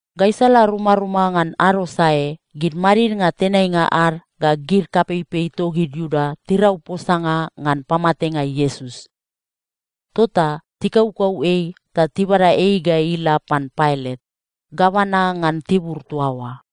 Gaisala rumaruma ngan ado sae, gid madidnga tenainga ad ga gid kapeipei togid Iuda tirau posanga ngan pamatenga Iesus. Tota tikaukau ei ta tibada ei ga ila pan Pailat, gavana ngan tibur toa oa.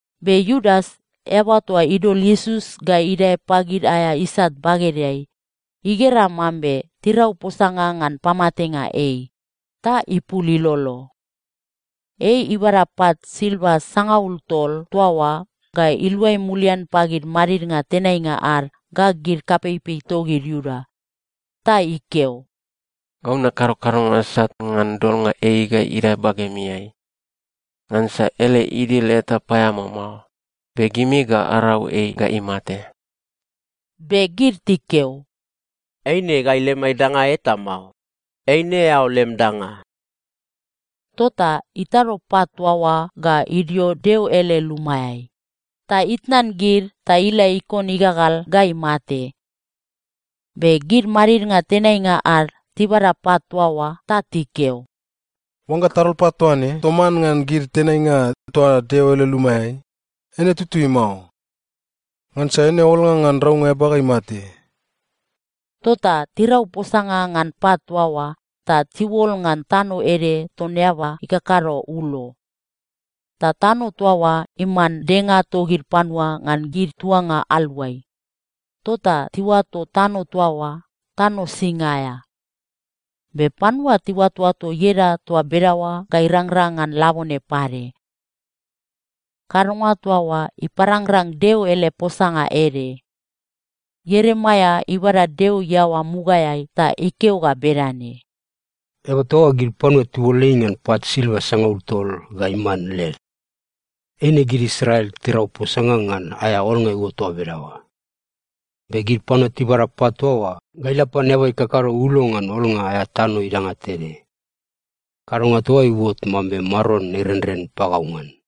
Be Iudas, eaba toa idol Iesus ga idae pagid aea isat bagedeai, igera mambe tirau posanga ngan pamatenga ei, ta ipul ilolo. Ei ibada pat silva sangaul tol toa oa ga iluai mulian pagid madidnga tenainga ad ga gid kapeipei togid Iuda. Ta ikeo, “Gau nakado kadonga sat ngan dolnga ei ga idae bagemiai. Ngansa ele idil eta paeamao mao, be gimi ga arau ei ga imate.” Be gid tikeo, “Eine gai lemai danga eta mao. Eine eao lem danga.” Tota itado pat toa oa ga idio Deo ele lumaeai, ta itnan gid ta ila ikon igagal ga imate. Be gid madidnga tenainga ad tibada pat toa oa ta tikeo, “Oangga tadol pat toa ne toman ngan gid tenainga toa Deo ele lumaeai, eine tutui mao. Ngansa eine olnga ngan raunga eaba ga imate.” Tota tirau posanga ngan pat toa oa ta tiuol ngan tano ede ton eaba ikakado ulo. Ta tano toa oa iman denga togid panua ngan gid tuanga aluai. Tota tiuato tano toa oa, “Tano Sing aea.” Be panua tiuatoato ieda toa bedaoa ga irangrang ngan labone pade. Kadonga toa oa iparangrang Deo ele posanga ede. Ieremaia ibada Deo iaoa mugaeai ta ikeo ga bedane, “Eaba toa oa, gid panua tiuol ei ngan pat silva sangaul tol ga iman led. Eine gid Israel tirau posanga ngan aea olnga iuot toa bedaoa. Be gid panua tibada pat toa oa ga ila pan eaba ikakado ulo ngan olnga aea tano idanga tede. Kadonga toa oa iuot mambe Maron irenren pagau ngan.”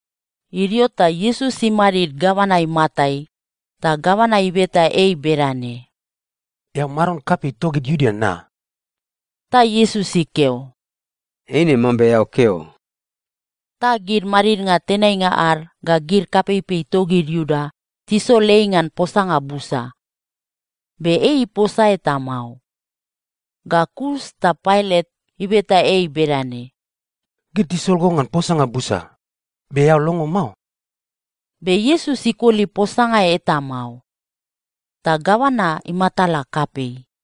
Idio ta Iesus imadid gavana imatai, ta gavana ibeta ei bedane, “Eao maron kapei togid Iuda na?” Ta Iesus ikeo, “Eine mambe eao keo.” Ta gid madidnga tenainga ad ga gid kapeipei togid Iuda tisol ei ngan posanga busa. Be ei iposa eta mao. Ga kus ta Pailat ibeta ei bedane, “Gid tisol go ngan posanga busa, be eao longo mao?” Be Iesus ikoli posanga eta mao. Ta gavana imatala kapei.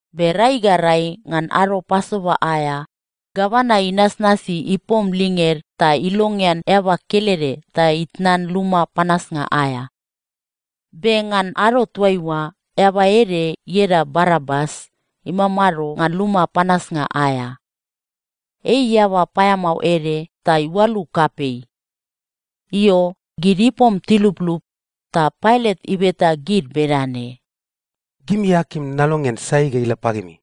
Be rai ga rai ngan ado Pasova aea, gavana inasnasi ipom linged ta ilongean eaba kelede ta itnan luma panasnga aea. Be ngan ado toaiua, eaba ede ieda Barabas imamado ngan luma panasnga aea. Ei eaba paeamao ede ta iualu kapei. Io, gid ipom tiluplup, ta Pailat ibeta gid bedane, “Gimi akim nalongean sai ga ila pagimi?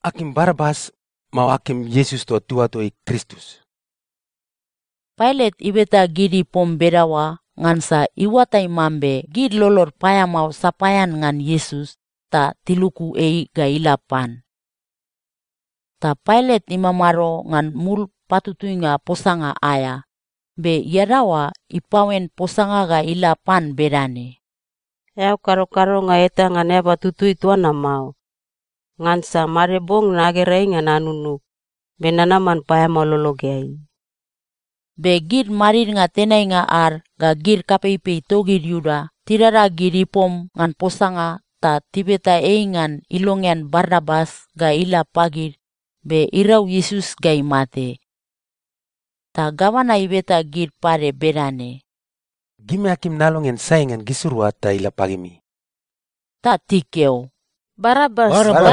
Akim Barabas, mao akim Iesus toa tiuato ei Kristus?” Pailat ibeta gid ipom bedaoa ngansa iuatai mambe gid lolod paeamao sapaean ngan Iesus ta tiluku ei ga ila pan. Ta Pailat imamado ngan mul patutuinga posanga aea, be iadaoa ipaoen posanga ga ila pan bedane, “Eao kado kadonga eta ngan eaba tutui toa na mao. Ngansa made bong nagera ei ngan anunug, be nanaman paeamao lologeai.” Be gid madidnga tenainga ad ga gid kapeipei togid Iuda tidada gid ipom ngan posanga ta tibeta ei ngan ilongean Barabas ga ila pagid be irau Iesus ga imate. Ta gavana ibeta gid pade bedane, “Gimi akim nalongean sai ngan gisirua ta ila pagimi?” Ta tikeo, “Barabas!”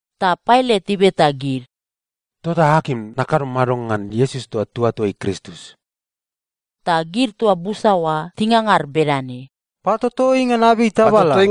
Ta Pailat ibeta gid, “Tota akim nakado mado ngan Iesus toa tiuato ei Kristus?” Ta gid toa busa oa tingangar bedane, “Patoto ei ngan abei tabala!”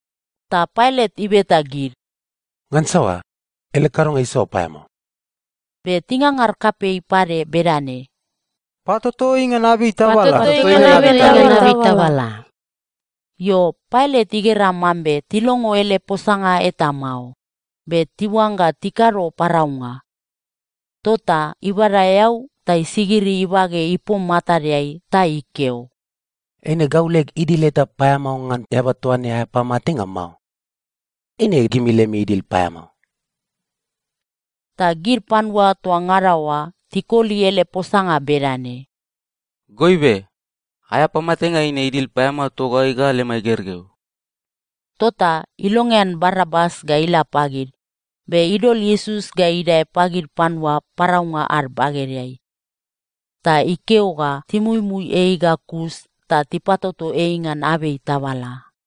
Ta Pailat ibeta gid, “Ngan saoa? Ele kadonga isaoa paeamao?” Be tingangar kapei pade bedane, “Patoto ei ngan abei tabala!” Io, Pailat igera mambe tilongo ele posanga eta mao, be tiuangga tikado paraunga. Tota ibada eau ta isigiri ibage ipom matadeai ta ikeo, “Eine gau leg idil eta paeamao ngan eaba toa ne aea pamatenga mao. Eine gimi lemi idil paeamao.” Ta gid panua toa ngada oa tikoli ele posanga bedane, “Goibe, aea pamatenga eine idil paeamao togai ga lemai gergeu.” Tota ilongean Barabas ga ila pagid, be idol Iesus ga idae pagid panua paraunga ad bagedeai. Ta ikeo ga timuimui ei ga kus ta tipatoto ei ngan abei tabala.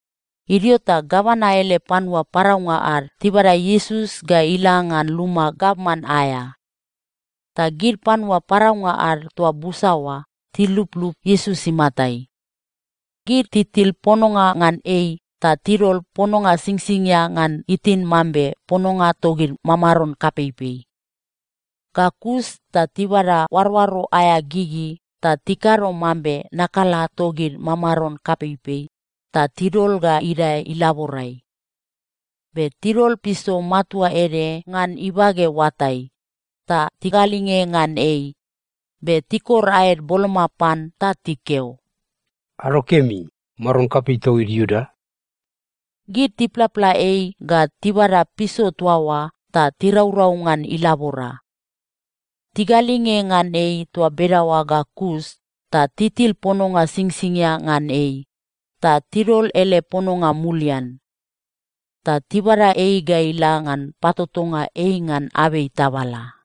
Idio ta gavana ele panua paraunga ad tibada Iesus ga ila ngan luma gavman aea. Ta gid panua paraunga ad toa busa oa tiluplup Iesus imatai. Gid titil pononga ngan ei ta tidol pononga singsingia ngan itin mambe pononga togid mamaron kapeipei. Ga kus ta tibada oaroaro aea gigi ta tikado mambe nakala togid mamaron kapeipei ta tidol ga idae ilaborai. Be tidol piso matua ede ngan ibage oatai, ta tigalinge ngan ei. Be tikor aed boloma pan ta tikeo, “Ado kemi, maron kapei togid Iuda!” Gid tiplapla ei ga tibada piso toa oa ta tiraurau ngan ilabora. Tigalinge ngan ei toa bedaoa ga kus ta titil pononga singsingia ngan ei, ta tidol ele pononga mulian. Ta tibada ei ga ila ngan patotonga ei ngan abei tabala.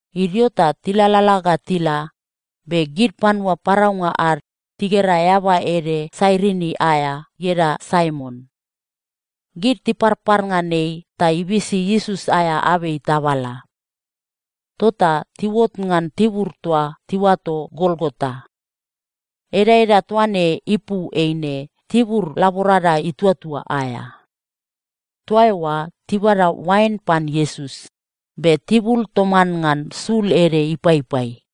Idio ta tilalala ga tila, be gid panua paraunga ad tigera eaba ede Sairini aea ieda Saimon. Gid tiparpar ngan ei ta ibisi Iesus aea abei tabala. Tota tiuot ngan tibur toa tiuato Golgota. Edaeda toa ne ipu eine Tibur Laborada Ituatua aea. Toa eoa tibada oain pan Iesus, be tibul toman ngan sul ede ipaipai.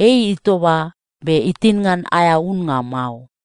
Ei itoba, be itin ngan aea unnga mao.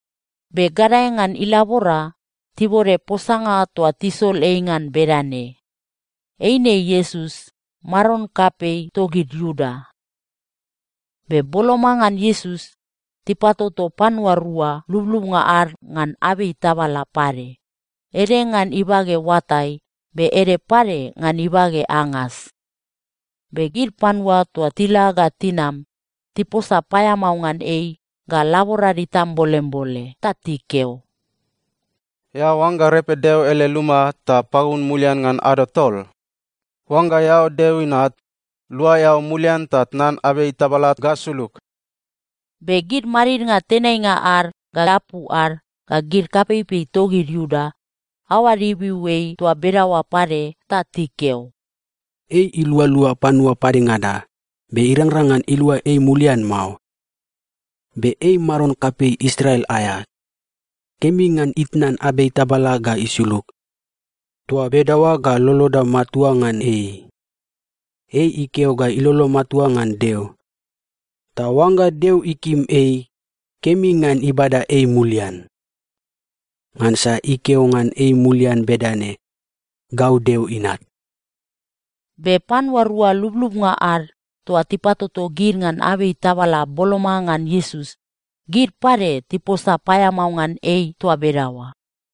Be gadae ngan ilabora, tibode posanga toa tisol ei ngan bedane, “Eine Iesus, maron kapei togid Iuda.” Be boloma ngan Iesus, tipatoto panua rua lublubnga ad ngan abei tabala pade, ede ngan ibage oatai, be ede pade ngan ibage angas. Be gid panua toa tila ga tinam, tiposa paeamao ngan ei ga laborad itambolembole ta tikeo, “Eao oangga repe Deo ele luma ta pagun mulian ngan ado tol? Oangga eao Deo Inat, lua eao mulian ta tnan abei tabala ga sulug!” Be gid madidnga tenainga ad ga apu ad ga gid kapeipei togid Iuda, aoad ibiu ei toa bedaoa pade ta tikeo, “Ei ilualua panua padengada, be irangrang ngan ilua ei mulian mao. Be ei maron kapei Israel aea! Kemi ngan itnan abei tabala ga isulug. Toa bedaoa ga loloda matua ngan ei. Ei ikeo ga ilolo matua ngan Deo. Ta oangga Deo ikim ei, kemi ngan ibada ei mulian. Ngansa ikeo ngan ei mulian bedane, ‘Gau Deo Inat.’” Be panua rua lublubnga ad toa tipatoto gid ngan abei tabala boloma ngan Iesus, gid pade tiposa paeamao ngan ei toa bedaoa.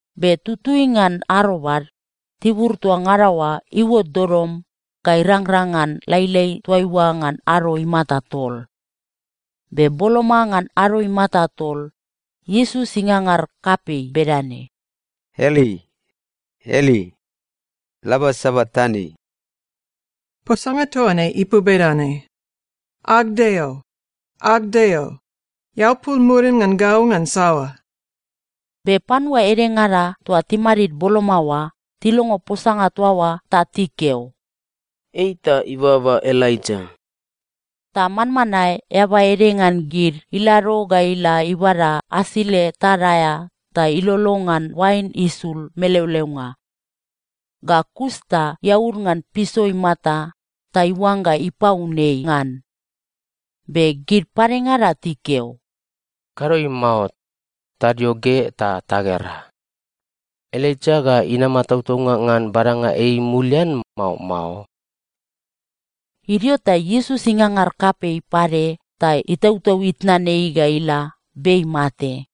Be tutui ngan arobad, tibur toa ngada oa iuot dodom ga irangrang ngan lailai toaiua ngan ado imata tol. Be boloma ngan ado imata tol, Iesus ingangar kapei bedane, “Eli, Eli, lama sabaktani.” Posanga toa ne ipu bedane, “Ag Deo, ag Deo, eao pul murim ngan gau ngan saoa?” Be panua edengada toa timadid boloma oa tilongo posanga toa oa ta tikeo, “Ei ta ibaba Elaija!” Ta manmanae eaba ede ngan gid ilado ga ila ibada asile tad aea ta ilolo ngan oain isul meleoleonga. Ga kus ta iaud ngan piso imata ta iuangga ipaun ei ngan. Be gid padengada tikeo, “Kado ei mao. Tadio ge ta tagera. Elaija ga inama tautaunga ngan badanga ei mulian, mao mao?” Idio ta Iesus ingangar kapei pade ta itautau itnan ei ga ila be imate.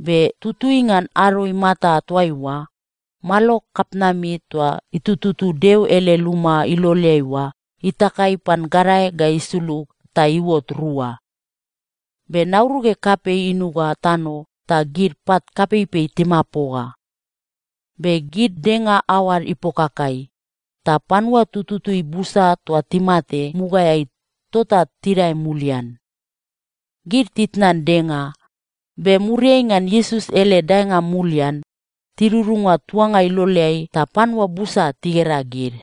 Be tutui ngan ado imata toaiua, malo kapitnami toa itututu Deo ele luma iloleai oa, itakai pan gadae ga isulug ta iuot rua. Be nauruge kapei inuga tano ta gid pat kapeipei timapoga. Be gid denga aoad ipokakai, ta panua tututui busa toa timate mugaeai tota tidae mulian. Gid titnan denga, be muriai ngan Iesus ele daenga mulian, tidudunga tuanga iloleai ta panua busa tigera gid.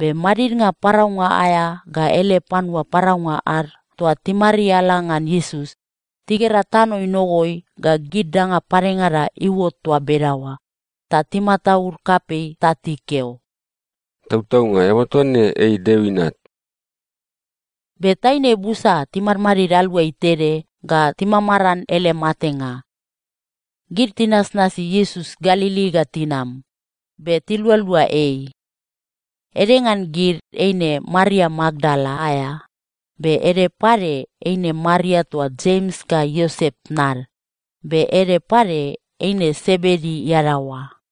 Be madidnga paraunga aea ga ele panua paraunga ad toa timariala ngan Iesus, tigera tano inogoi ga gid danga padengada iuot toa bedaoa, ta timataud kapei ta tikeo, “Tautaunga, eaba toa ne, ei Deo Inat!” Be taine busa timadmadid aluai tede ga timamaran ele matenga. Gid tinasnasi Iesus Galili ga tinam, be tilualua ei. Ede ngan gid, eine Maria Makdala aea, be ede pade eine Maria toa Jems ga Iosep tnad, be ede pade eine Sebedi iadaoa.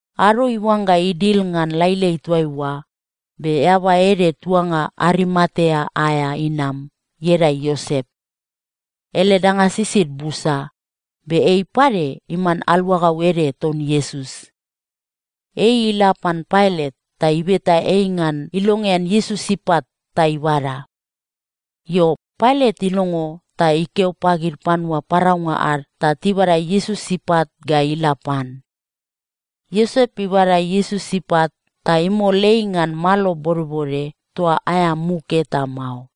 Ado iuangga idil ngan lailai toaiua, be eaba ede tuanga Arimatea aea inam, ieda Iosep. Ele danga sisid busa, be ei pade iman aluagau ede ton Iesus. Ei ila pan Pailat ta ibeta ei ngan ilongean Iesus ipat ta ibada. Io, Pailat ilongo ta ikeo pagid panua paraunga ad ta tibada Iesus ipat ga ila pan. Iosep ibada Iesus ipat ta imol ei ngan malo bodbode toa aea muk eta mao.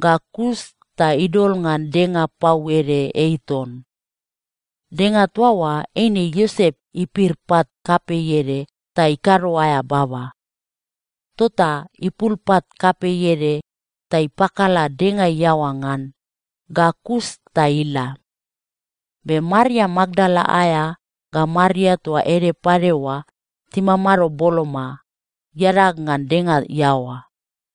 Ga kus ta idol ngan denga pau ede ei ton. Denga toa oa eine Iosep ipir pat kapei ede ta ikado aea baba. Tota ipul pat kapei ede ta ipakala denga iaoa ngan, ga kus ta ila. Be Maria Makdala aea ga Maria toa ede pade oa timamado boloma, iadag ngan denga iaoa.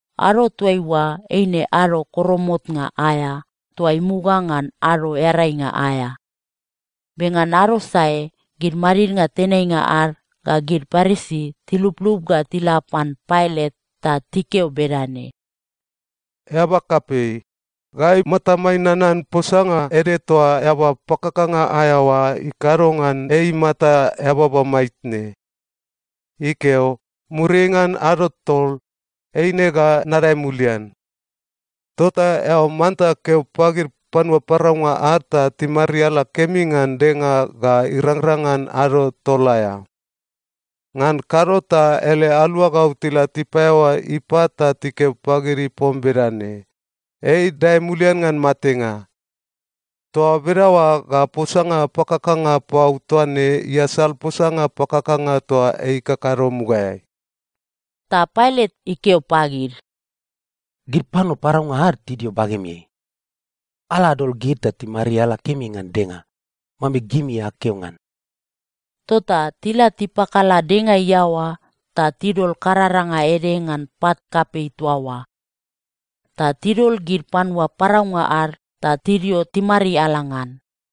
Ado toaiua eine Ado Koromotnga aea toa imuga ngan Ado Earainga aea. Be ngan ado sae gid madidnga tenainga ad ga gid Parisi tiluplup ga tila pan Pailat ta tikeo bedane, “Eaba kapei, gai matamai nanan posanga ede toa eaba pakakanga aea oa ikado ngan ei imata eababa maitne. Ikeo, ‘Muriai ngan ado tol, eine ga nadae mulian.’ Tota eao manta keo pagid panua paraunga ad ta timariala kemi ngan denga ga irangrang ngan ado tol aea. Ngan kado ta ele aluagau tila tipaeaoa ipat ta tikeo pagid ipom bedane, ‘Ei idae mulian ngan matenga.’ Toa bedaoa ga posanga pakakanga pau toa ne iasal posanga pakakanga toa ei ikakado mugaeai.” Ta Pailat ikeo pagid, “Gid panua paraunga ad tidio bagemiai. Ala adol gid ta timariala kemi ngan denga, mambe gimi akeo ngan.” Tota tila tipakala denga iaoa ta tidol kararanga ede ngan pat kapei toa oa. Ta tidol gid panua paraunga ad ta tidio timariala ngan.